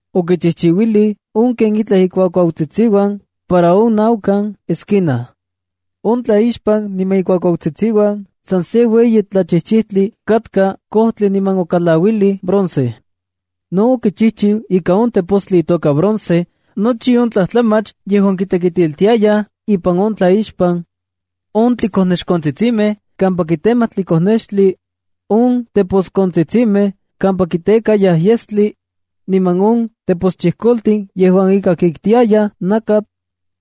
Okichijchiuilij on ken itlaj ikuakuautsitsiuan para on naukan esquina. On tlaixpan niman ikuakuautsitsiuan san se ueyi tlachijchijtli katka kojtli niman okalauilij bronce. No okichijchiu ika on tepostli itoka bronce nochi on tlajtlamach yejuan kitekitiltiayaj ipan on tlaixpan: on tlikonexkontsitsimej kampa kitemayaj tlikonextli, on teposkontsitsimej kampa kitekayaj yestli, niman on teposchijkoltin yejuan ika kiktsiayaj nakatl,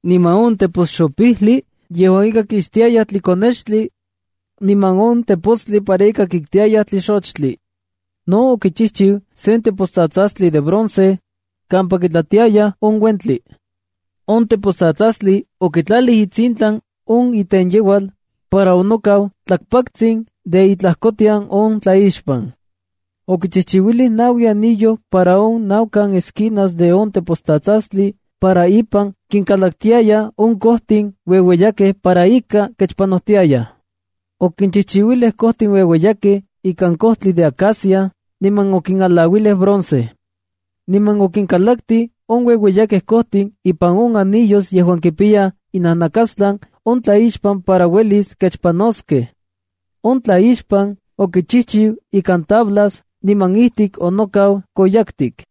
niman on teposxopijli yejuan ika kixtiayaj tlikonextli, niman on tepostli para kiktiyaj tlixochtli. No okichijchiu sen tepostsatsastli de bronce, kampa kitlatiayaj on uentli. On tepostsatsastli okitlalij itsintlan on itenyeual para nokaua tlakpaktsin de itlajkotian on tlaixpan. Okichijchiuilij naui anillo para on naukan esquinas de on tepostsastsastli para ipan kinkalaktiayaj on kojtin ueueyakej para ika kechpanojtiayaj. Okinchijchiu kojtin ueueyakej ikan kojtli de acacia niman okinalauilij bronce. Niman okinkalaktij on ueueyakej kojtin ipan on anillos yejuan kipiya inajnakastlan on tlaixpan para uelis kechpanojtiaskej. On tlaixpan okichijchiu ikan tablas niman ijtik onokau koyaktik.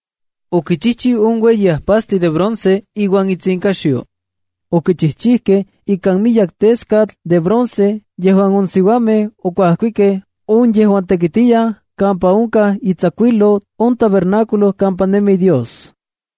Okichijchiu on ueyi ajpastli de bronce iuan itsinkaxyo. Okichijchijkej ikan miyek teskatl de bronce yejuan on siuamej okuajkikej on yejuan tekitiyaj kampa onkaj itsakuijlou on tabernáculo kampa nemi Dios.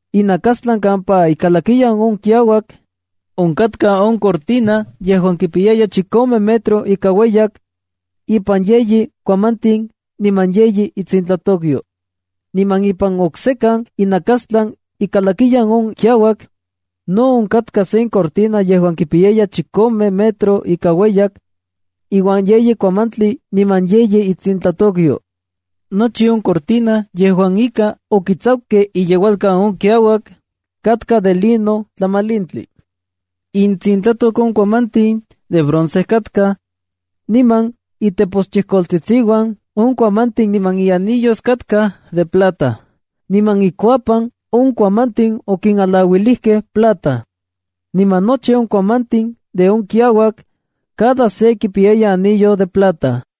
Inakastlan kampa ikalakiyan on kiauak, onkatka on cortina yejuan kipiyaya chikome metro ika ueyak, ipan yeyi kuamantin niman yeyi itsintlatokyo. Niman ipan oksekan inakastlan ikalakiyan on kiauak, no onkatka sen cortina yejuan kipiyaya chikome metro ika ueyak, iuan yeyi kuamantli niman yeyi itsintlatokyo. Nochi on cortina yejuan ika okitsakukej iyeualkan on kiauak, katka de lino tlamalintli. Intsintlatok on kuamantin de bronce katkaj, niman iteposchijkoltsitsiuan on kuamantin niman ianillos katkaj de plata. Niman ikuapan on kuamantin okinalauilij plata. Niman nochi on kuamantin de on kiauak, cada se kipiyaya ianillo de plata.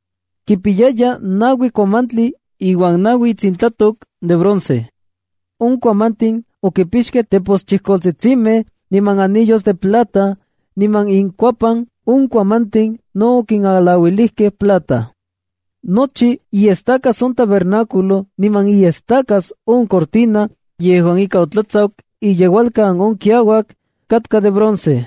Kipiyaya naui kuamantli iuan naui itsintlatok de bronce. On kuamantin okipixkej teposchijkoltsitsimej niman anillos de plata, niman inkuapan on kuamantin no okinalauilijkej plata. Nochi iestacas on tabernáculo niman iestacas on cortina yejuan ika otlatsaku iyeualkan on kiauak, katka de bronce.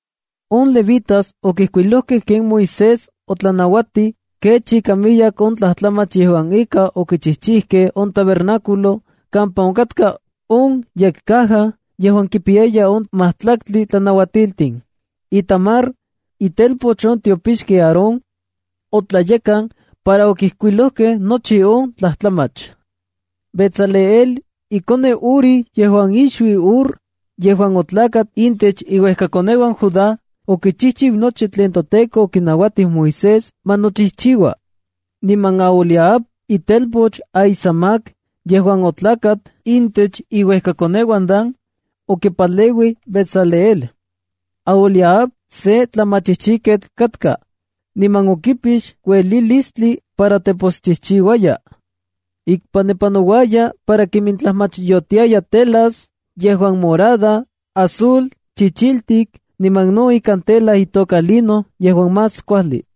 On levitas okijkuilojkej ken Moisés otlanauatij kech ika miyek on tlajtlamach yejuan ika okichijchijkej on tabernáculo, kampa onkatka on yekcaja yejuan kipiyaya on matlaktli tlanauatiltin. Itamar, itelpoch on tiopixki Aarón, otlayekan para okijkuilojkej nochi on tlajtlamach. Bezaleel, ikoneu Uri yejuan ixuiu Hur yejuan otlakat intech iuekakoneuan Judá, okichijchiu nochi tlen toTEKO okinauatij Moisés ma nochijchiua. Niman Aholiab, itelpoch Ahisamac yejuan otlakat intech iuejkakoneuan Dan, okipaleuij Bezaleel. Aholiab se tlamachijchijketl katka, niman okipix uelilistli para teposchijchiuaya. Ikpanepanouaya para kimintlajmachyotiaya telas yejuan morada, azul, chichiltik niman no ikan tela itoka lino yejuan más kuajli.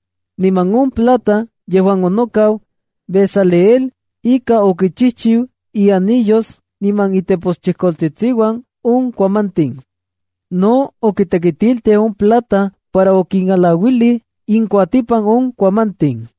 Niman on plata yejuan onokau, Bezaleel ika okichijchiu ianillos niman iteposchijkoltsitsiuan on kuamantin. No okitekitiltij on plata para okinalauilij inkuatipan on kuamantin.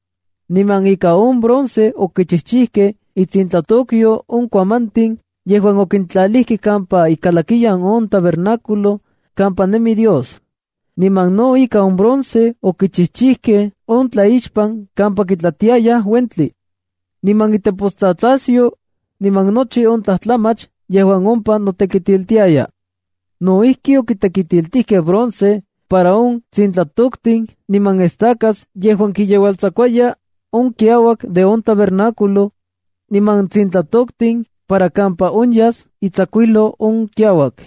Niman ika on bronce okichijchijkej intsintlatokyo on kuamantin yejuan okintlalijkej kampa ikalakiyan on tabernáculo kampa nemi Dios. Niman no ika on bronce okichijchijkej on tlaixpan kampa kitlatiayaj uentli, niman itepostsatsasyo, niman nochi on tlajtlamach yejuan ompa notekitiltiaya. No ijki, okitekitiltijkej bronce para on tsintlatoktin niman estacas yejuan kiyeualtsakuaya on kiauak de on tabernáculo, niman tsintlatoktin para kampa onyas itsakuijlou on kiauak.